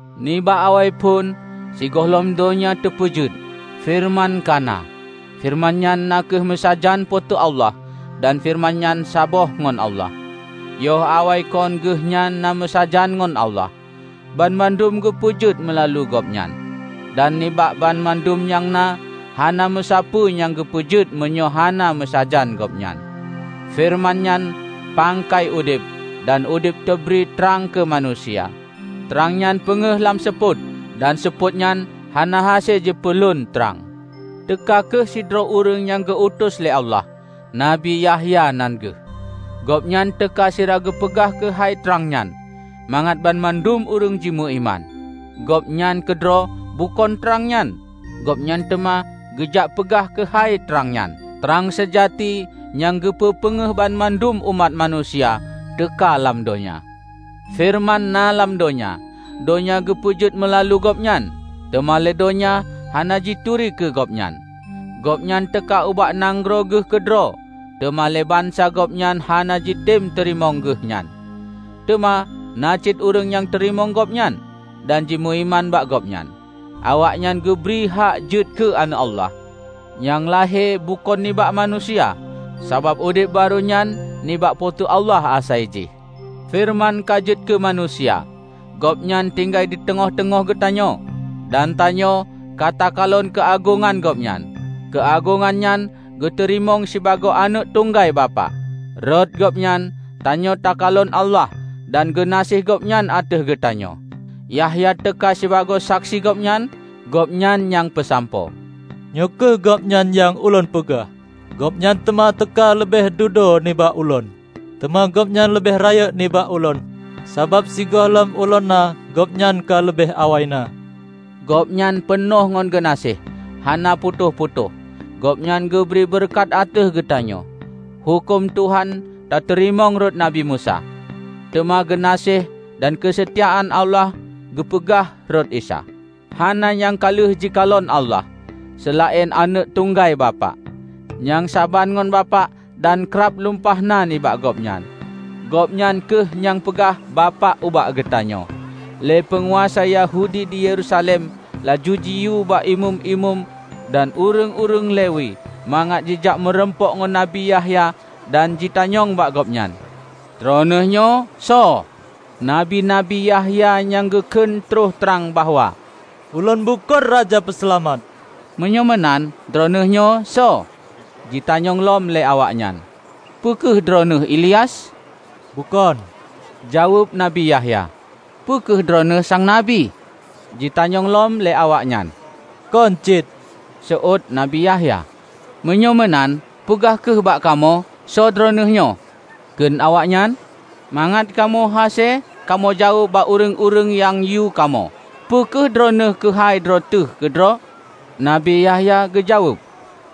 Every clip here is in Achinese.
Nibak awaiphon, sigohlom donya teupeujeuet, Feureuman ka na. Feureuman nyan na meusajan Po teu Allah dan Feureuman nyan saban ngon Allah. Yoh awai kon Geuhnyan na meusajan ngon Allah. Banmandum geupeujeuet meulalu Gobnyan, dan nibak banmandum nyang na, hana meusapeue nyang geupeujeuet meunyoe hana meusajan Gobnyan. Feureuman nyan pangkai udeb, dan udeb teubri trang keu manusia. Trang nyan peungéh lam seupôt, dan seupôt nyan hana hase jipeulon trang. Teuka kheueh sidroe ureuëng nyang geu-utus lé Allah, Nabi Yahya nan geuh. Gobnyan teuka sira geupeugah keuhai trang nyan, mangat banmandum ureuëng jimeuiman. Gobnyan keudroe bukon trang nyan, gobnyan teuma geujak peugah keuhai trang nyan. Trang seujati nyang geupeupeungeuh banmandum umat manusia, teuka lam donya. Feureuman na lam donya, donya geupeujeuet meulalu Gobnyan, teuma lé donya hana jituri keu Gobnyan. Gobnyan teuka ubak nanggroe Geuh keudroe, teuma lé bansa Gobnyan hana jitem teurimong Geuh nyan. Teuma na cit ureuëng nyang teurimong Gobnyan, dan jimeuiman bak Gobnyan; awaknyan geubri hak jeuet keu Aneuëk Allah, nyang lahé bukon nibak manusia, sabab udeb barô nyan nibak Po teu Allah asai jih. Feureuman ka jeuet keu manusia, Gobnyan tinggai diteungoh-teungoh geutanyoe, dan tanyoe ka takalon keuagongan Gobnyan. Keuagongan nyan geuteurimong sibagoe aneuëk tunggai Bapak. Rot Gobnyan tanyoe takalon Allah dan geunaséh Gobnyan ateueh geutanyoe. Yahya teuka sibagoe saksi Gobnyan, gobnyan nyang peusampoe: "Nyoe kheueh Gobnyan nyang ulôn peugah: Gobnyan teuma teuka leubeh dudoe nibak ulôn. Teuma Gobnyan leubeh rayeuk nibak ulôn, sabab sigohlom ulôn na, Gobnyan ka leubeh awai na." Gobnyan peunoh ngan geunaséh; hana putôh-putôh, Gobnyan geubri beureukat ateueh geutanyoe. Huköm Tuhan tateurimong rot Nabi Musa. Teuma geunaséh dan keuseutiaan Allah geupeugah rot Isa. Hana nyang ka lheueh jikalon Allah, seulaén aneuëk tunggai Bapak, nyang saban ngon Bapak dan krab lumpah na nibak Gobnyan. Gobnyan kheueh nyang peugah Bapak ubak geutanyoe. Lé peunguasa Yahudi di Yerusalem laju jiyue bak Imeum-imeum dan ureuëng-ureuëng Lewi mangat jijak meurumpok ngon Nabi Yahya dan jitanyong bak gobnyan, "Droeneueh nyoe soe?" Nabi Nabi Yahya nyan geukheun troh trang bahwa, "Ulôn bukon Raja Peuseulamat." "Meunyoe meunan, droeneueh nyoe soe?" jitanyong lom lé awaknyan. "Peu kheueh droeneueh Ilyas?" "Bukon," jaweueb Nabi Yahya. "Peu kheueh droeneueh Sang Nabi?" jitanyong lom lé awaknyan. "Kon cit," seuôt Nabi Yahya. "Meunyoe meunan, peugah kheueh bak kamoe soe droeneueh nyoe," kheun awaknyan, "mangat kamoe hase kamoe jaweueb bak ureuëng-ureuëng nyang yue kamoe. Peue kheun droeneueh keuhai droe teuh keudroe?" Nabi Yahya geujaweueb,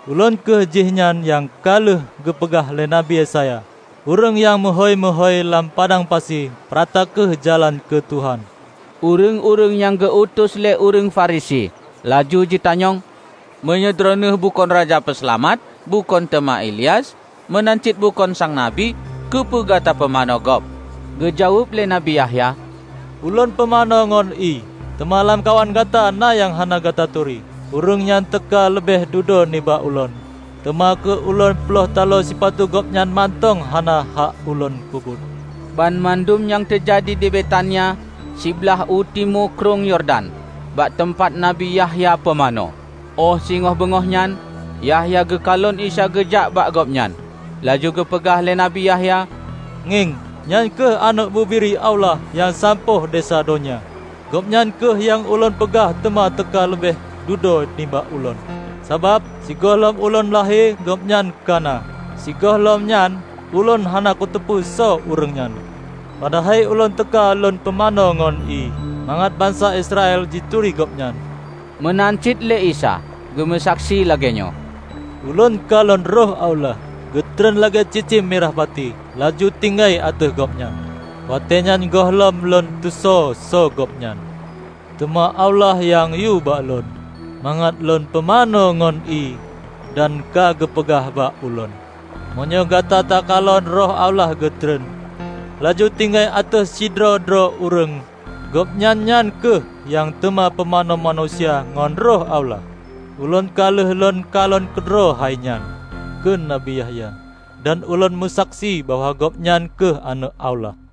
"Ulôn kheueh jihnyan nyang ka lheueh geupeugah lé Nabi Yesaya: 'Ureuëng nyang meuhôi-meuhôi lam padang pasi: Peurata kheueh jalan keu Tuhan.' " Ureuëng-ureuëng nyang geu-utus lé ureuëng Farisi laju jitanyong, "Meunyoe droeneueh bukon Raja Peuseulamat, bukon teuma Ilyas, meunan cit bukon sang Nabi, keupeue gata pumanö gob?" Geujaweueb lé Nabi Yahya, "Ulôn pumanö ngon ié. Teuma lamkawan gata na nyang hana gata turi. Ureuëng nyan teuka leubeh dudoe nibak ulôn, teuma keu lôn ploih talo sipatu Gobnyan mantong hana hak ulôn peubuet." Banmandum nyan teujadi di Betania, siblaih u timu Krueng Yordan bak teumpat Nabi Yahya Pumanö. Óh singoh beungoh nyan, Yahya geukalon Isa geujak bak gobnyan. Laju geupeugah lé Nabi Yahya, "Ngieng, nyan kheueh Aneuëk Bubiri Allah nyang sampôh desya donya. Gobnyan kheueh nyang ulôn peugah teuma teuka leubeh dudoe nibak ulôn, sabab, sigohlom ulôn lahé Gobnyan ka na. Sigohlom nyan, ulôn hana kuteupeue soe ureuëng nyan. Padahai ulôn teuka lôn pumanö ngon ié, mangat bansa Israel jituri Gobnyan." Meunan cit lé Isa geumeusaksi lagée nyoe, "Ulôn kalon Roh Allah geutreun lagée cicém mirah pati laju tinggai ateueh Gobnyan. Watée nyan gohlom lôn tusoe soe Gobnyan. Teuma Allah nyang yue bak ulôn mangat lôn pumanö ngon ié dan ka geupeugah bak ulôn, 'Meunyoe gata takalon Roh Allah geutreun, laju tinggai ateueh sidroe-droe ureuëng, Gobnyan nyan kheueh nyang teuma pumanö manusia ngon Roh Allah.' Ulôn ka lheueh lôn kalon keudroe hainyan," kheun Nabi Yahya, "dan ulôn meusaksi bahwa Gobnyan kheueh Aneuëk Allah."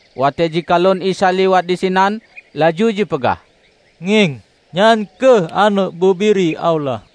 Watée jikalon Isa lewat disinan, laju jipeugah, "Ngieng! Nyan kheueh Aneuëk Bubiri Allah."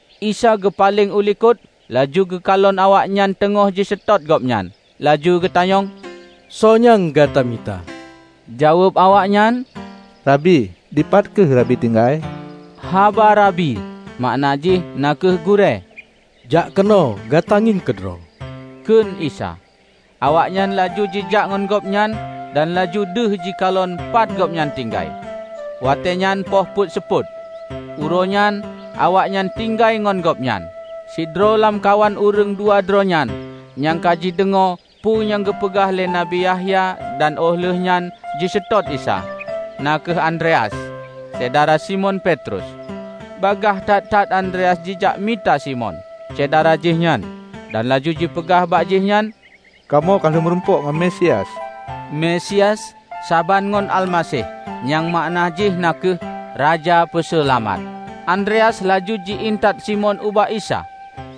Isa geupaleng u likot, laju geukalon awaknyan teungoh jiseutôt Gobnyan. Laju geutanyong, "Soe nyang gata mita?" Jaweueb awaknyan, "Rabi, dipat kheueh Rabi tinggai?" (Haba 'Rabi' makna jih na kheueh gurée.) "Jak keunoe gata ngieng keudroe," kheun Isa. Awaknyan laju jijak ngon Gobnyan dan laju deuh jikalon pat Gobnyan tinggai. Watée nyan poh peuet seupôt. Uroenyan awaknyan tinggai ngon Gobnyan. Sidroe lamkawan ureuëng dua droe nyan nyang ka jideungoe peue nyang geupeugah lé Nabi Yahya dan óh lheueh nyan jiseutôt Isa, na kheueh Andreas, syedara Simon Petrus. Bagaih that-that Andreas jijak mita Simon, syedara jihnyan, dan laju jipeugah bak jih nyan, "Kamoe ka lheueh murumpok ngon Mesias!" (Mesias saban ngon Almaseh, nyang makna jih na kheueh: Raja Peuseulamat.) Andreas laju ji intat Simon ubak Isa.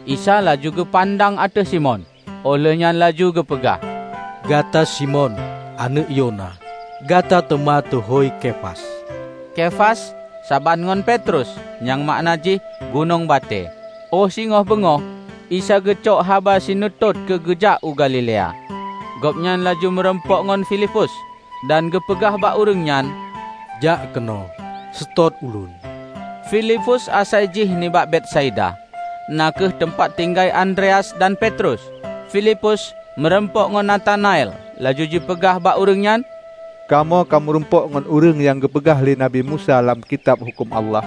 Isa laju geupandang ateueh Simon, óh lheuehnyan laju geupeugah, "Gata Simon, aneuëk Yona, gata teuma teuhôi Kefas." (Kefas saban ngon Petrus, nyang makna jih: gunong batée.) Óh singoh beungoh Isa geucok haba sinutôh keu geujak u Galilea. Gobnyan laju meurumpok ngon Filipus, dan geupeugah bak ureuëng nyan, "Jak keunoe seutôt ulôn!" Filipus asai jih nibak Betsaida, na kheueh teumpat tinggai Andreas dan Petrus. Filipus meurumpok ngon Natanael laju jipeugah bak ureuëng nyan, "Kamoe ka meurumpok ngon ureuëng nyang geupeugah lé Nabi Musa lam Kitab Huköm Allah,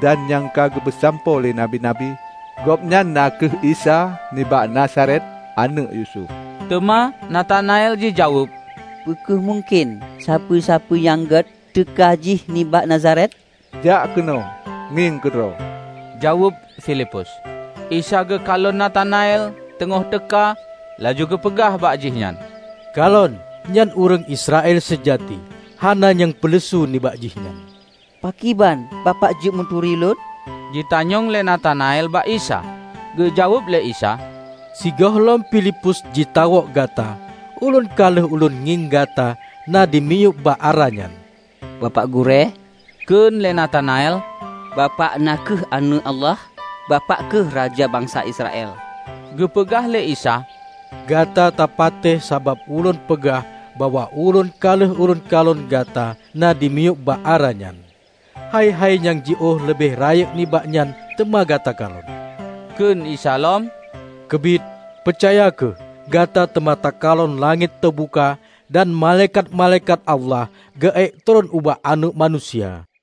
dan nyang ka geupeusampoe lé Nabi-nabi. Gobnyan na kheueh Isa nibak Nazaret, aneuëk Yusuf." Teuma Natanael jijaweueb, "Peu kheueh mungken sapeue-sapeue nyang gét teuka jih nibak Nazaret?" "Jak keunoe, ngieng keudroe," jaweueb Filipus. Isa geukalon Natanael teungoh teuka laju geupeugah bak jihnyan, "Kalon, nyan ureuëng Israel seujati, hana nyang peuleusu nibak jihnyan." "Pakriban Bapak jeuet neuturi ulôn?" jitanyong lé Natanael bak Isa. Geujaweueb lé Isa, "Sigohlom Filipus jitawök gata, ulôn ka lheueh ulôn ngieng gata na dimiyueb bak ara nyan." "Bapak Gurée," kheun lé Natanael, "Bapak na kheueh Aneuëk Allah! Bapak kheueh Raja bansa Israel!" Geupeugah lé Isa, "Gata tapatéh, sabab ulôn peugah bahwa ulôn ka lheueh lôn kalon gata na dimiyueb bak ara nyan? Hai-hai nyang jiôh leubeh rayeuk nibak nyan teuma gata kalon!" Kheun Isa lom, "Keubiet, peucaya kheueh, gata teuma takalon langét teubuka, dan malaikat-malaikat Allah geuék treuen bak Aneuëk Manusia."